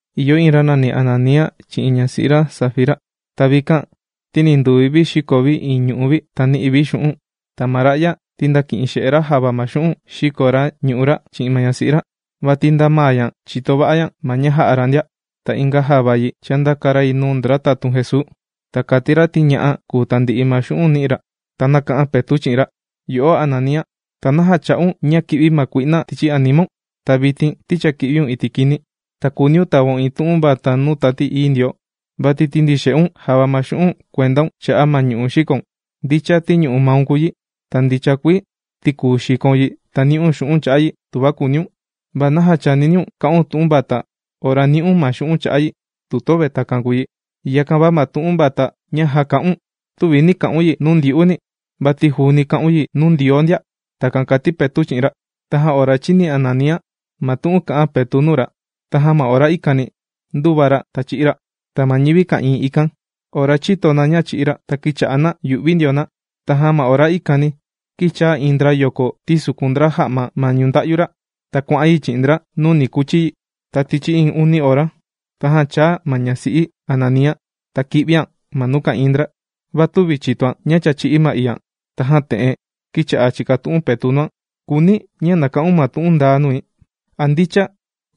Ìyo iin ra nàni Ananía chi'in ñasi'i ra Safira. Ta vikan, ti ni nduvi vi xīko vi iin ñu'u' vi, ta nī'i vi xu'un'. Ta ma ra'ya, ti ndāki'in xe'e ra java ma xu'un' xīko ra ñu'u' ra chi'in ma ñasi'i ra, vati nda maa ña chìto va'a ña ma ña jā'a ra ndia. Ta inga java yi, chāndaka ra yi nuu ndra tatun Jesuu, ta kàti ra ti ña'a kùu tandi'i ma xu'un' nī'i ra. Ta nāka'an Petu' chi'in ra: ―Yo'o Ananía, ¿ta naja chā'un ña kī'vi ma kui'na tichi animaun? Ta vitin ti cha kī'viun iti' kini, ta kùuniun tavaun iin tu'un vata nuu Tati Ií Ndioo, vati tīndixe'un java ma xu'un' kuendaun cha'a' ma ñu'u' xīkoun. Ndicha ti ñu'u' maun kùu yi, ta ndicha kuii ti kùu xikoun yi ta ni'un xu'un' cha'a' yi, tuva kùuniun. ¿Va naja chāniniun ka'un tu'un vata ora nī'un ma xu'un' cha'a' yi, tuva yöve takan kùu yi? Yakan va ma tu'un vata ña já kā'un, tüvi nī ka'un yi nuu ndyu'uni, vati juuni kà'un yi nuu Ndioo ndia. ―Takan kàti Petu' chi'in ra. Tajan ora chīni Ananía ma tu'un kā'an Petu' nuu ra, tajan ma ora ikani ndūva ra ta chī'í ra. Ta ma ñivi ka'ìin ikan, ora chīto na ña chī'í ra, ta kīcha'a na yù'vi ndio na. Tajan ma ora ikani kīchaa iin ndra yoko tīsukun ndra ja'ma ma ñunda'yu ra. Ta kuà'an yi chi'in ndra nuu ni kuchi yi. Ta tichi iin uni ora, tajan chāa ma ñasi'i Ananía, ta kī'vian ma nuu ka'ìin ndra. Va tüvi chìtoan ña cha chī'í ma iian. Tajan te'en kīcha'a chìkatu'un Petu' nuan: ―Kùuni̱ ña na ka'un ma tu'un ndaa nui. ¿A ndicha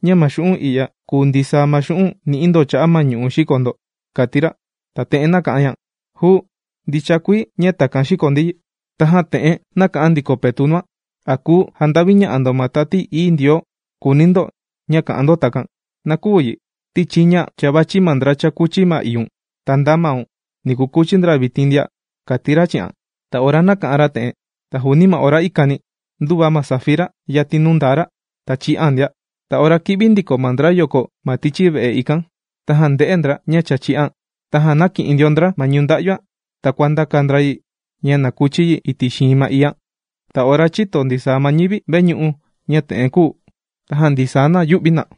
ña ma xu'un' i'ya kùu ndisaa ma xu'un' nī'i ndo cha'a' ma ñu'u' xīko ndo? ―kàti ra. Ta te'en nāka'an ña: ―¡Juu! Ndicha kuii ña takan xīko ndi yi. Tajan te'en nāka'an ndiko Petu' nuan: ―¿A kuu janda'viña'a ndo ma Tati Ií Ndioo, kùuni ndo ña kà'an ndo takan? ¡Na küu yi! Ti chiña cha vàchi ma ndra chākuchi ma iiun. ¡Ta nda maun, ni kukuchi ndra vitin ndia! ―kàti ra chi'an. Ta ora nāka'an ra te'en, ta juuni ma ora ikani ndūva ma Safira yatin nuu ndaa ra, ta chī'an ndia. Ta ora kī'vi ndiko ma ndra yoko ma tichi ve'e ikan, ta ndē'e ndra ña cha chī'an. Tajan ndāki'in ndio ndra ma ñunda'yuan ta kuàndaka ndra yi ña na kuchi yi iti' xiin ma iian. Ta ora chīto ndisaa ma ñivi veñu'u ña te'en kūu, tajan ndisaa na yū'vi na.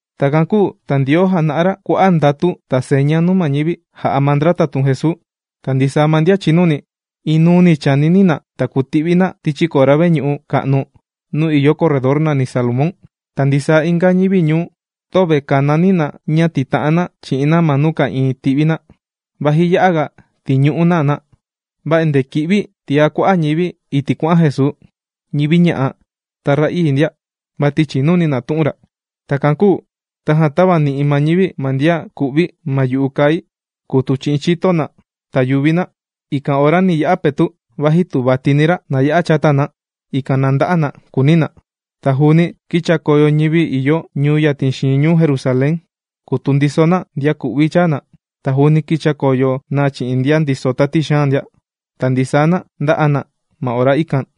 Takan kūu ta Ndioo jàna'a ra kua'a' ndatu ta seña nuu ma ñivi, jà'a ma ndra tatun Jesuu. Ta ndisaa ma ndian chìnuni, inuuni chànini na ta kùti'vi na tichi kora veñu'u ka'nu nuu ìyo corredor nàni Salomón. Ta ndisaa inga ñivi ñuu, töve kànani na ña tìta'an na chi'in na ma nuu ka'ìin tì'vi na, vaji ya'a ga tìñu'u na na. Va endee kì'vi tiá kua'a' ñivi iti' kuà'an Jesuu, ñivi ña'a ta ra'ii ndia, vati chìnuni na tu'un ra. Takan kūu tajan tāvani'i ma ñivi ma ndian ku'vi ma yu'u kai kùtu chi'in chito na ta yuvi na. Ikan ora ni ya'a Petu', vaji tu vatini ra, na ya'a chata na, ikan na nda'a na, kùuni na. Ta juuni, kīchakoyo ñivi ìyo ñuu yatin xiin ñuu Jerusalén, kùtu ndiso na ndian ku'vi chàa na. Ta juuni kīchakoyo na chi'in ndian ndiso tati xaan ndia. Ta ndisaa na ndā'a na ma ora ikan.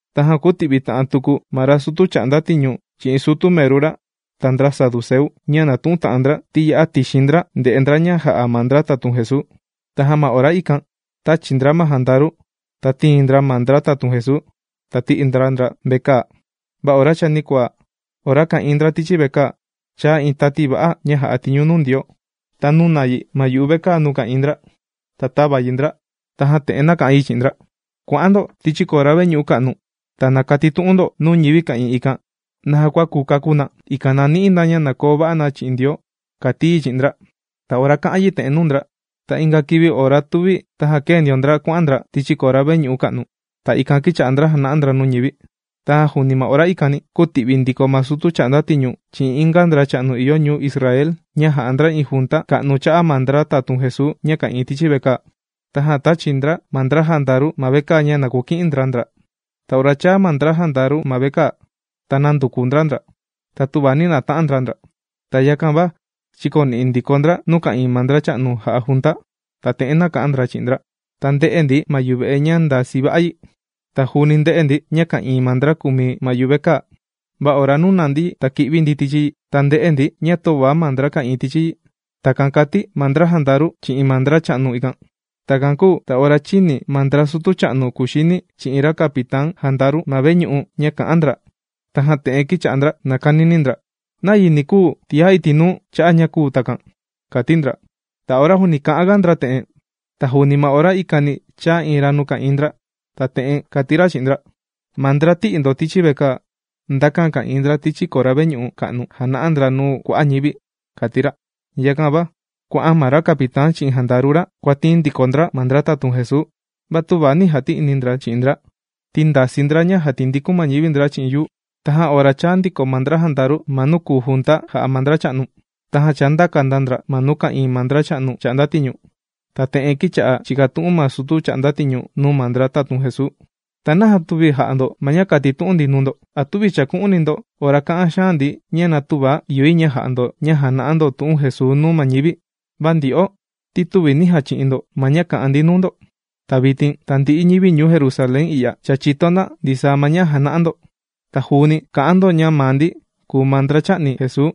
Tajan kūti'vi ta'an tuku ma ra sutu chà'nda tiñu chi'in sutu meru ra ta ndra saduceu, ña nàtu'un ta'an ndra, ti ya'a tixin ndra ndè'e ndra ña jà'a ma ndra tatun Jesuu. Tajan ma ora ikan tāchi ndra ma jandaru, ta tīin ndra ma ndra tatun Jesuu, ta tī'i ndra ndra vekaa. Va ora chanikuaa ora ka'ìin ndra tichi vekaa, chāa iin tati va'a ña jà'a tiñu nuu Ndioo. Ta nūna yi ma yuve'e nuu ka'ìin ndra, ta tāva yi ndra. Tajan te'en nāka'an yi chi'in ndra: ―¡Kua'an ndo tichi kora veñu'u ka'nu! ¡Ta na katitu'un ndo nuu ñivi ka'ìin ikan naja kua kuu kakú na, ikan na ni'i na ña na koo va'a na chi'in Ndioo! ―kàti yi chi'in ndra. Ta ora kā'an yi te'en nuu ndra, ta inga kivi ora tuvi tajan kēe ndio ndra kuà'an ndra tichi kora veñu'u ka'nu. Ta ikan kīcha'a ndra jàna'a ndra nuu ma ñivi. Tajan juuni ma ora ikan, kūti'vi ndiko ma sutu chà'nda tiñu chi'in inga ndracha'nu ìyo ñuu Israel ña jà'a ndra iin junta ka'nu cha'a' ma ndra tatun Jesuu ña ka'ìin tichi ma vekaa. Tajan tāchi ndra ma ndra jandaru ma vekaa ña na kuki'in ndra ndra. Ta ora chāa ma ndra jandaru ma vekaa, ta nānduku ndra ndra. Ta töva nī nata'an ndra ndra. Ta yakan va chīkoni'i ndiko ndra nuu ka'ìin ma ndracha'nu jà'a junta. Ta te'en nāka'an ndra chi'in ndra: ―Ora chāa ndi ma vekaa, ta ndē'e ndi ma yuve'e ña ndàsi va'a yi. Ta juuni ndē'e ndi ña ka'ìin ma ndra kùmi ma yuvekaa. Va ora nūna ndi ta kī'vi ndi tichi yi, ta ndē'e ndi ña töva ma ndra ka'ìin tichi yi. ―Takan kàti ma ndra jandaru chi'in ma ndracha'nu ikan. Takan kūu ta ora chīni ma ndra sutu cha'nu kuxini chi'in ra capitán jandaru ma veñu'u ña kà'an ndra, tajan te'en kīcha'a ndra nàkanini ndra: ―¿Nayi ni kuu tiá iti' nuu cha'a' ña kūu takan? ―kùuni ndra. Ta ora juuni kà'anga ndra te'en, ta juuni ma ora ikani chāa iin ra nuu ka'ìin ndra ta te'en kàti ra chi'in ndra: ―Ma ndra, tī'i ndo tichi vekaa, ndakan ka'ìin ndra tichi kora veñu'u ka'nu jàna'a ndra nuu kua'a' ñivi ―kàti ra. Yakan va, kuà'an ma ra capitán chi'in jandaru ra, kuàtiin ndiko ndra ma ndra tatun Jesuu. Va tüva nī jati'ini ndra chi'in ndra, ti ndasii ndra ña jàtindikun ma ñivi ndra chi'in yuu. Tajan ora chāa ndiko ma ndra jandaru ma nuu kùu junta jà'a ma ndracha'nu, tajan chāndaka ndra ndra nuu ka'ìin ma ndracha'nu chà'nda tiñu. Ta te'en kīcha'a chìkatu'un ma sutu chà'nda tiñu nuu ma ndra tatun Jesuu: ―¿Ta naja tüvi jà'a ndo ma ña kātitu'un ndi nuu ndo? ¿A tüvi chàku'uni ndo ora kā'an xaan ndi ña na tüva ìyo yi ña ja'a ndo ña jàna'a ndo tu'un Jesuu nuu ma ñivi? Va ndyo'o ti tüvi nī jachi'in ndo ma ña kā'an ndi nuu ndo. Ta vitin tandi'i ñivi ñuu Jerusalén i'ya, cha chìto na ndisaa ma ña jàna'a ndo. Ta juuni kà'an ndo ña maa ndi kùu ma ndra chā'ni Jesuu.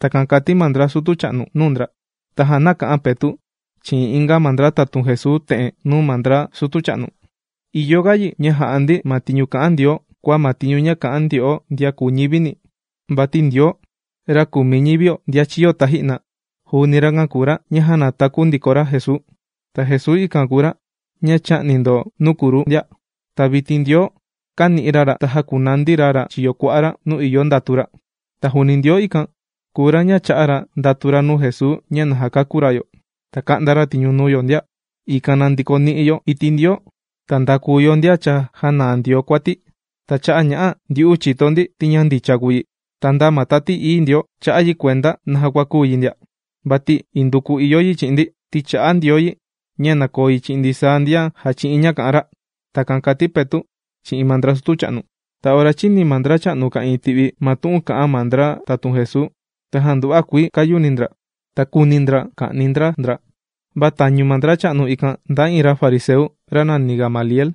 ―Takan kàti ma ndra sutu cha'nu nuu ndra. Tajan nāka'an Petu' chi'in inga ma ndra tatun Jesuu te'en nuu ma ndra sutu cha'nu: ―Ìyo ga yi ña jà'a ndi ma tiñu kà'an Ndioo, kua ma tiñu kà'an ndyo'o ndian kùu ñivini. Vati Ndioo, ra kùmi ñivio ndian chīyo taji'na, juuni rakan kùu ra ña jānataku ndiko ra Jesuu. Ta Jesuu ikan kùu ra ña chā'ni ndo nuu kruu ndia. Ta vitin Ndioo kāni'i ra ra ta jākunandi ra ra chiyo kua'a ra nuu ìyo ndatu ra. Ta juuni Ndioo ikan, kùu ra ña chā'a ra ndatu ra nuu Jesuu ña na jakakú ra yo, ta ka'nda ra tiñu nuu yo ndia, ikan na ndikoni'i yo iti' Ndioo, ta ndakuu yo ndian cha jānaa Ndioo kuati. Ta cha'a' ña'a ndyu'u chìto ndi ti ña ndicha kùu yi. Ta nda ma Tati Ií Ndioo, chā'a yi kuenda naja kua kūu yi ndia, vati induku ìyo yi chi'in ndi, ti chà'a Ndioo yi ña na koo yi chi'in ndisaa ndian jàchi'in ña kà'an ra. ―Takan kàti Petu' chi'in ma ndra sutu cha'nu. Ta ora chīni ma ndracha'nu ka'ìin ti'vi, ma tu'un kà'an ma ndra tatun Jesuu, tajan nduva'a kuii kāyuni ndra, ta kūuni ndra ka'ni ndra ndra. Va tañu ma ndracha'nu ikan ndaa iin ra fariseu, ra nàni Gamaliel.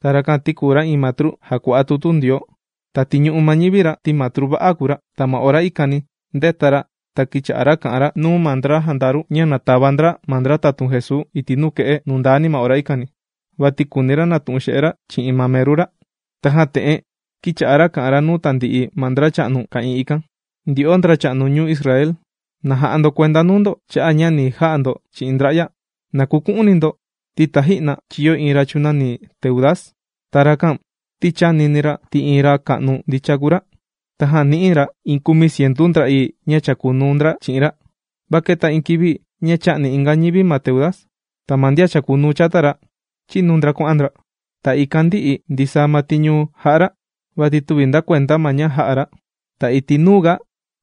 Ta rakan ti kùu ra iin matru jàkua'a tutu Ndioo. Ta tìñu'u ma ñivi ra ti matru va'a kùu ra. Ta ma ora ikani, ndēta ra ta kīcha'a ra kà'an ra nuu ma ndra jandaru, ña na tava ndra ma ndra tatun Jesuu iti' nuke'e nundani ma ora ikan, vati kùuni ra natu'un xe'e ra chi'in ma meru ra. Tajan te'en kīcha'a ra kà'an ra nuu tandi'i ma ndracha'nu ka'ìin ikan: ―Ndyo'o ndracha'nu ñuu Israel, ¡na ja'a ndo kuenda nuu ndo cha'a' ña ni ja'a ndo chi'in ndra'ya! ¡Na kuku'uni ndo ti taji'na chīyo iin ra chūnani Teudas! Ta rakan ti chānini ra ti iin ra ka'nu ndicha kuii kùu ra. Tajan nī'i ra iin kumi cientu ndra'ii ña chàkunuu ndra chi'in ra. Va kēta iin kivi ña chā'ni inga ñivi ma Teudas. Ta ma ndian chàkunuu chata ra, chīnu ndra kuà'an ndra. Ta ikan ndī'i ndisaa ma tiñu jà'a ra vati tüvi nda kuenda ma ña jā'a ra. Ta iti' nuuga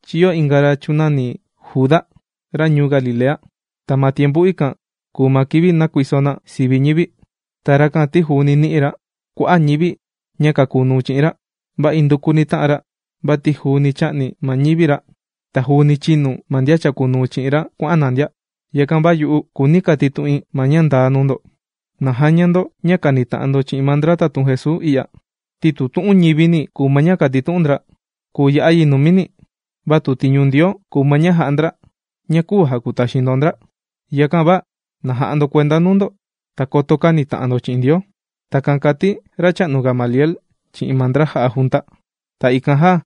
chīyo inga ra chūnani Juda, ra ñuu Galilea. Ta ma tiempu ikan kùu ma kivi nākuiso na sivi ñivi. Ta rakan ti juuni nī'i ra kua'a' ñivi ña kàkunuu chi'in ra. Va indukuni tā'an ra vati juuni chā'ni ma ñivi ra. Ta juuni chīnu ma ndian chàkunuu chi'in ra kuà'an na ndia. Yakan va yu'u, kùuni katitu'in iin ma ña ndaa nuu ndo. ¡Na jaña ndo ña kànita'an ndo chi'in ma ndra tatun Jesuu i'ya! Ti tu tu'un ñivini kùu ma ña kàtitu'un ndra, kùu ya'a yi numini. Va tu tiñu Ndioo kùu ma ña jà'a ndra, na küu jakutaxin ndo ndra. ¡Yakan va na ja'a ndo kuenda nuu ndo, ta koto känita'an ndo chi'in Ndioo! ―Takan kàti racha'nu Gamaliel chi'in ma ndra jà'a junta. Ta ikan jan,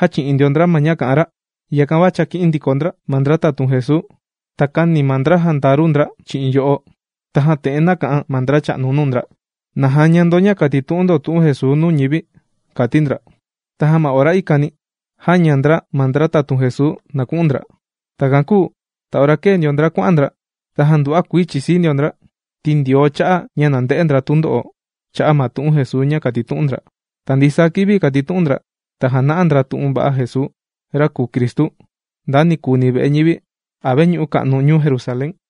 jāchi'in ndio ndra ma ña kà'an ra. Yakan va chāki'in ndiko ndra ma ndra tatun Jesuu, ta kāni ma ndra jandaru ndra chi'in yo'o. Tajan te'en nāka'an ma ndracha'nu nuu ndra: ―¡Na jaña ndo ña kàtitu'un ndo tu'un Jesuu nuu ñivi! ―kàti ndra. Tajan ma ora ikani jāña ndra ma ndra tatun Jesuu na ku'un ndra. Takan kūu ta ora kēe ndio ndra kuà'an ndra, tajan nduva'a kuii chìsii ndio ndra, ti Ndioo chā'a ña na nde'e ndra tundo'o cha'a' ma tu'un Jesuu ña kàtitu'un ndra. Ta ndisaa kivi kàtitu'un ndra, ta jàna'a ndra tu'un va'a Jesuu, ra kùu Cristu, nda nikuuni ve'e ñivi a veñu'u ka'nu ñuu Jerusalén.